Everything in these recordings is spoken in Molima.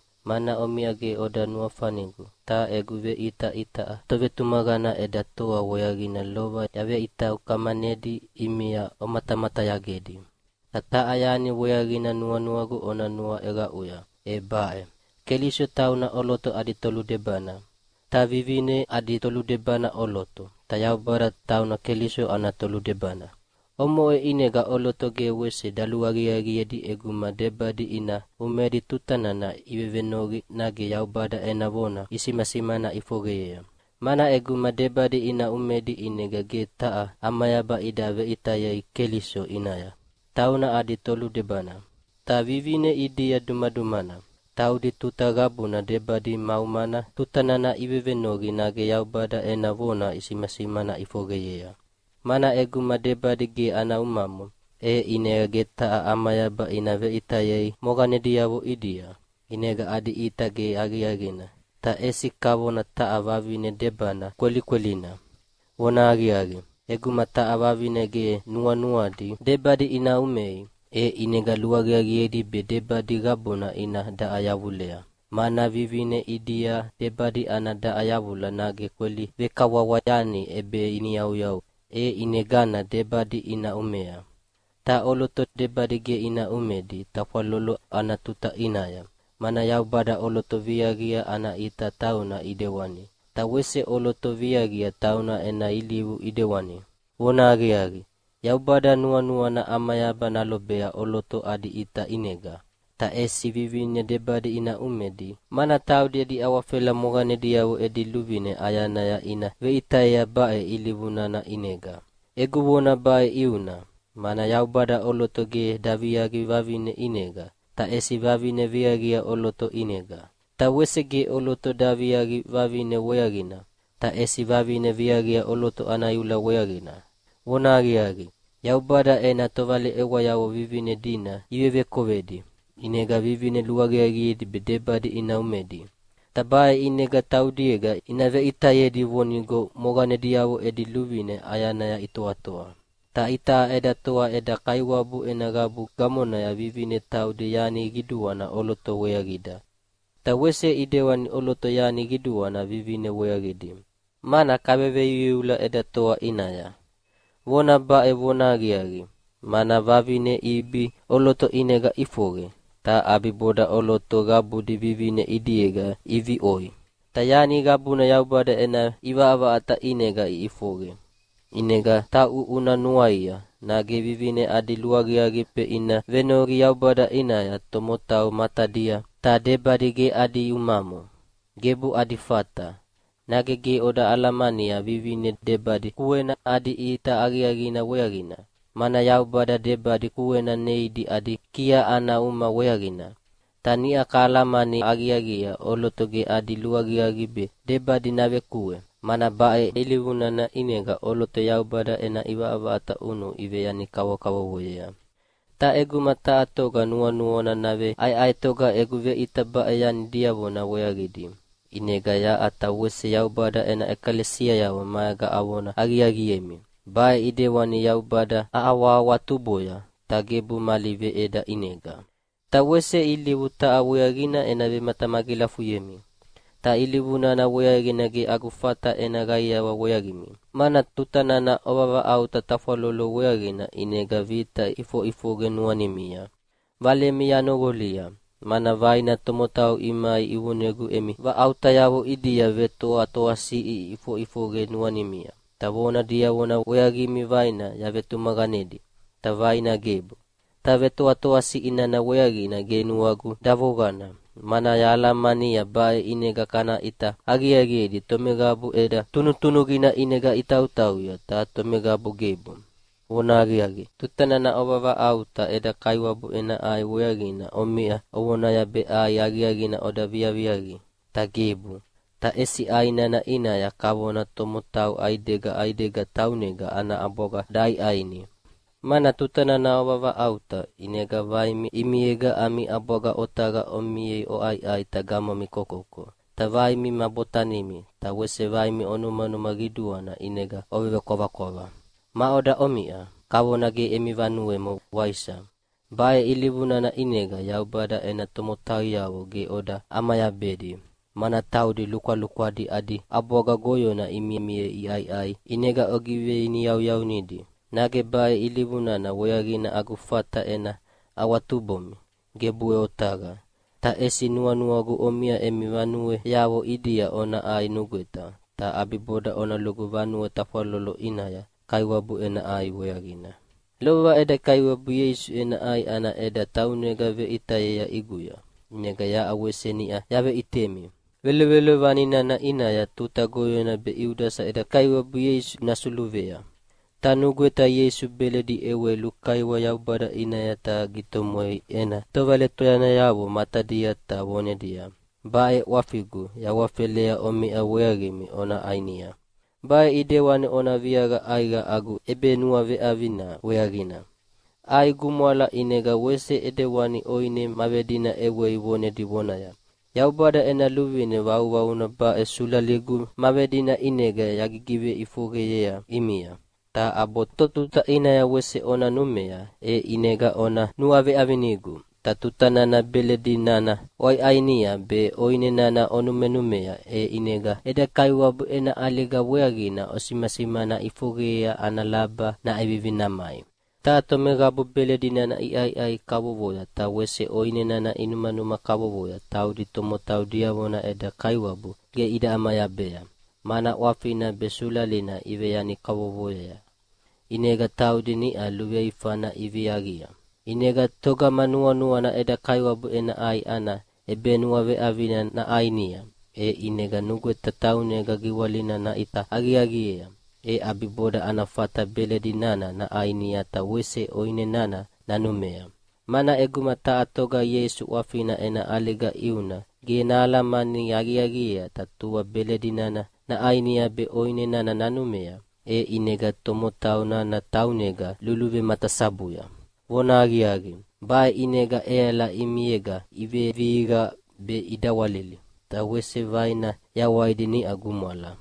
Omiʼa me Kolinita yaqaiawa weaqimi, mana omiʼa ge oda nuafanigu, ta egu veʼita itaʼa tovetumaqana eda toa weaqina lova yaveʼita ukamanedi ʼimia omatamatayagedi. Ta taha yani weaqina nuanuagu ona nuaʼeqaʼuya, e baʼe: Keliso tauna ʼoloto adi toludebana. Ta vivine adi toludebana ʼoloto. Ta Yaubada tauna Keliso ana toludebana. Omoʼe ʼinega ʼoloto ge wese daluaqiaqiedi ʼeguma debadi ina umedi tuta nana ivevenoqi nage Yaubada ena vona isimasimana ʼifoqeyea. Mana ʼeguma debadi ina umedi ʼinega ge taha ʼamayaba ida veʼitayei Keliso ʼinaya, tauna adi toludebana. Ta vivine ʼidia dumadumana. Taudi tuta qabuna debadi ma umana tuta nana ivevenoqi nage Yaubada ena vona isimasimana ʼifoqeyea. Mana ʼeguma debadi ge ana umamo, e ʼinega ge taha ʼamayaba ina veʼitayei moqanediavo ʼidia, ʼinega adi ʼita ge aqiaqina, ta ʼesi kavona taha vavine debana kwelikwelina. Vonahaqiaqi, ʼeguma taha vavine ge nuanuadi debadi ina umei, e ʼinega luaqiaqiedi be debadi qabuna ina daʼa yavulea. Mana vivine ʼidia debadi ana daʼa yavula nage kweli vekawawa yani ʼebeiniyauyau, e ʼinegana debadi ina umea. Ta ʼoloto debadi ge ina umedi tafwalolo ana tuta ʼinaya, mana Yaubada ʼoloto viaqia ana ʼita tauna ʼidewani, ta wese ʼoloto viaqia tauna ena ilivu ʼidewani. Vonahaqiaqi, Yaubada nuanuana ʼamayaba nalobea ʼoloto adi ʼita ʼinega. Ta ʼesi vivine debadi ina umedi, mana taudi edi awafela moqanediavo edi luvine ʼayanaya ina veʼitayea baʼe ilivu nana ʼinega. Egu vona baʼe ʼiuna, mana Yaubada ʼoloto ge daviaqi vavine ʼinega, ta ʼesi vavine viaqia ʼoloto ʼinega. Ta wese ge ʼoloto daviaqi vavine weaqina, ta ʼesi vavine viaqia ʼoloto ana iula weaqina. Vonahaqiaqi, Yaubada ena tovaleʼewayavo vivine dina ivevekovedi, ʼinega vivine luaqiaqiedi be debadi ina umedi, ta baʼe ʼinega taudiega ina veʼitayedi vonigo moqanediavo edi luvine ʼayanaya itoatoa. Ta itaʼa eda toa eda Kaiwabu ena qabu gamonaya vivine taudi yani qiduana ʼoloto weaqida, ta wese ʼidewani ʼoloto yani qiduana vivine weaqidi, mana kaveveiuiula eda toa ʼinaya. Vona baʼe vonahaqiaqi, mana vavine Ibi ʼoloto ʼinega ʼifoqe, ta ʼabiboda ʼoloto qabudi vivine ʼidiega iviʼoi, ta yani qabuna Yaubada ena ʼivaʼavaʼata ʼinega iʼifoqe. ʼInega tauʼu una nuaia, nage vivine adi luaqiaqi be ina venoqi Yaubada ʼinaya tomotau matadia ta debadi ge adi umamo? Gebu adi fata! Nage ge oda alamania vivine debadi kuena adi ʼita aqiaqina weaqina. Mana Yaubada debadi kuena neidi adi kia ana uma weaqina. Ta niʼa kahalamani aqiaqiea ʼoloto ge adi luaqiaqi be debadi navekue, mana baʼe ilivu nana ʼinega ʼoloto Yaubada ena ʼivaʼavaʼata ʼunu iveyani kavokavovoyea. Ta ʼeguma taha toga nuanuana naveʼaeʼaetoga egu veʼita baʼe yani diavona weaqidi, ʼinega yaʼa ta wese Yaubada ena ʼekalesiayavo maega avona aqiaqiemi: Baʼe ʼidewani Yaubada ahawahawatuboya, ta gebu mali veʼeda ʼinega. Ta wese ilivu taha weaqina ena vematamagilafuyemi. Ta ilivu nana weaqina ge agu fata ena qaiawa weaqimi. Mana tuta nana ovavaʼauta tafwalolo weaqina ʼinega vita ʼifoʼifoqe nuanimia. Valemi yanoqolia, mana vaina tomotau imai ivonegu emi vaʼautayavo ʼidia vetoatoasiʼi ʼifoʼifoqe nuanimia. Ta vona diavona weaqimi vaina yavetumaqanedi, ta vaina gebu. Ta vetoatoasiʼi nana weaqina ge nuagu davoqana, mana yahalamania baʼe ʼinega kana ʼita aqiaqiedi tomeqabu ʼeda tunutunuqina ʼinega itautauya, ta tomeqabu gebu. Vonahaqiaqi, tuta nana ovavaʼauta eda Kaiwabu ena ʼai weaqina omiʼa ovonaya be ʼai aqiaqina oda viaviaqi, ta gebu. Ta ʼesi ʼai nana ʼinaya kavona tomotau ʼaidega ʼaidega taunega ana ʼabwaga daʼaiʼaini. Mana tuta nana ovavaʼauta, ʼinega vaina ʼimiega ami ʼabwaga otaqa omiea oʼaiʼai ta gamomi kokoko, ta vaina ma botanimi, ta wese vaina onumanuma qiduana ʼinega ovekwavakwava. Maʼoda omiʼa? Kavona ge emi vanuemo, waisa? Baʼe ilivu nana ʼinega Yaubada ena tomotauyavo ge oda ʼamayabedi, mana taudi lukwalukwadi adi ʼabwaga goyona imimiea iʼaiʼai, ʼinega ogiveiniyauyaunidi. Nage baʼe ilivu nana weaqina agu fata ena awatubomi? Gebuʼe otaqa! Ta ʼesi nuanuagu omiʼa emi vanueavo ʼidia ona ʼai nugweta, ta ʼabiboda ona lugu vanue tafwalolo ʼinaya Kaiwabu ena ʼai weaqina. Lova eda Kaiwabu Ieisu ena ʼai ana ʼeda taunega veʼitayea ʼiguya, ʼinega yaʼa wese niʼa yaveʼitemi. Velovelovani nana ʼinaya tuta goyona be Iudasa eda Kaiwabu Ieisu nasuluvea, ta nugweta Ieisu beledi ʼewei lukaiwa Yaubada ʼinaya ta gitomwei ena tovaletuyanayavo matadia ta vonedia, “Baʼe ʼwafigu yahawafelea omiʼa weaqimi ona ʼainia. Baʼe ʼidewani ona viaqa ʼaiqa agu ʼebenuaveʼavina weaqina.” ʼAi gumwala ʼinega wese ʼidewani ʼoine ma vedina ʼewei vonedi vonaya, “Yaubada ena luvine vauvauna baʼe sulaligu ma vedina ʼinega yagigiveʼifoqeyea ʼimia. Ta ʼabo totuta ʼinaya wese ona numea, e ʼinega ona nuaveʼavinigu.” Ta tuta nana beledi nana oʼaiʼainia be ʼoine nana onumenumea, e ʼinega eda Kaiwabu ena ʼaliga weaqina osimasimana ʼifoqeyea ana laba naʼevivi namai. Ta tomeqabu beledi nana iʼaiʼai kavovoya ta wese ʼoine nana inumanuma kavovoya taudi tomotau diavona eda Kaiwabu ge ida ʼamayabea, mana ʼwafina be sulalina iveyani kavokavovoyea, ʼinega taudi niʼa luveifana iviaqia. ʼInega togama nuanuana eda Kaiwabu ena ʼai ana ʼebenuaveʼavina naʼainia, e ʼinega nugweta taunega giwalina naʼita aqiaqiea. E ʼabiboda ana fata beledi nana naʼainia ta wese ʼoine nana nanumea. Mana ʼeguma taha toga Ieisu ʼwafina ena ʼaliga ʼiuna ge nahalamani aqiaqiea ta tua beledi nana naʼainia be ʼoine nana nanumea, e ʼinega tomotau nana taunega luluvematasabuya. Vonahaqiaqi, baʼe ʼinega ʼeala ʼimiega ivevihiqa be idawalili, ta wese vaina yawaidi niʼa gumwala.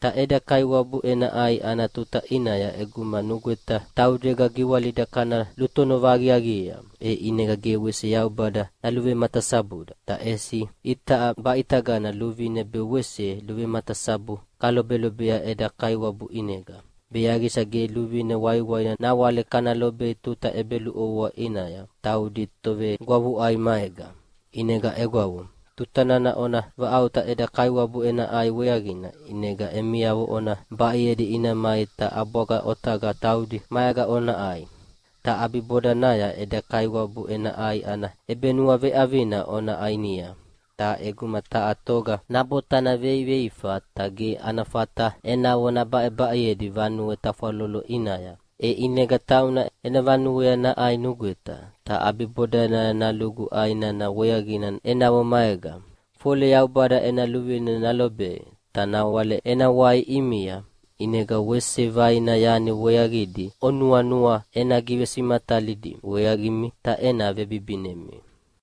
Ta eda Kaiwabu ena ʼai ana tuta ʼinaya ʼeguma nugweta taudega giwalida kana lutonova aqiaqiea, e ʼinega ge wese Yaubada naluvematasabuda. Ta ʼesi itaʼa baʼitagana luvine be wese luvematasabu kalobelobea eda Kaiwabu ʼinega, be yaqisa ge luvine waiwaina nawale kana lobei tuta ʼebeluʼovoa ʼinaya taudi tovegwavuʼai maega. ʼInega egwavo, tuta nana ona vaʼauta eda Kaiwabu ena ʼai weaqina, ʼinega emiavo ona baʼeyedi ina mai ta ʼabwaga otaqa taudi maega ona ʼai. Ta ʼabibodanaya eda Kaiwabu ena ʼai ana ʼebenuaveʼavina ona ʼainia. Ta ʼeguma taha toga nabotana veiveifa ta ge ana fata enavo nabaʼebaʼeyedi vanue tafwalolo ʼinaya, e ʼinega tauna ena vanuea naʼai nugweta, ta ʼabibodanaya nalugu ʼai nana weaqina enavo maega, fole Yaubada ena luvine nalobei. Ta nawale ena wai ʼimia, ʼinega wese vaina yani weaqidi onuanua ena givesimatalidi weaqimi ta ena vebibinemi.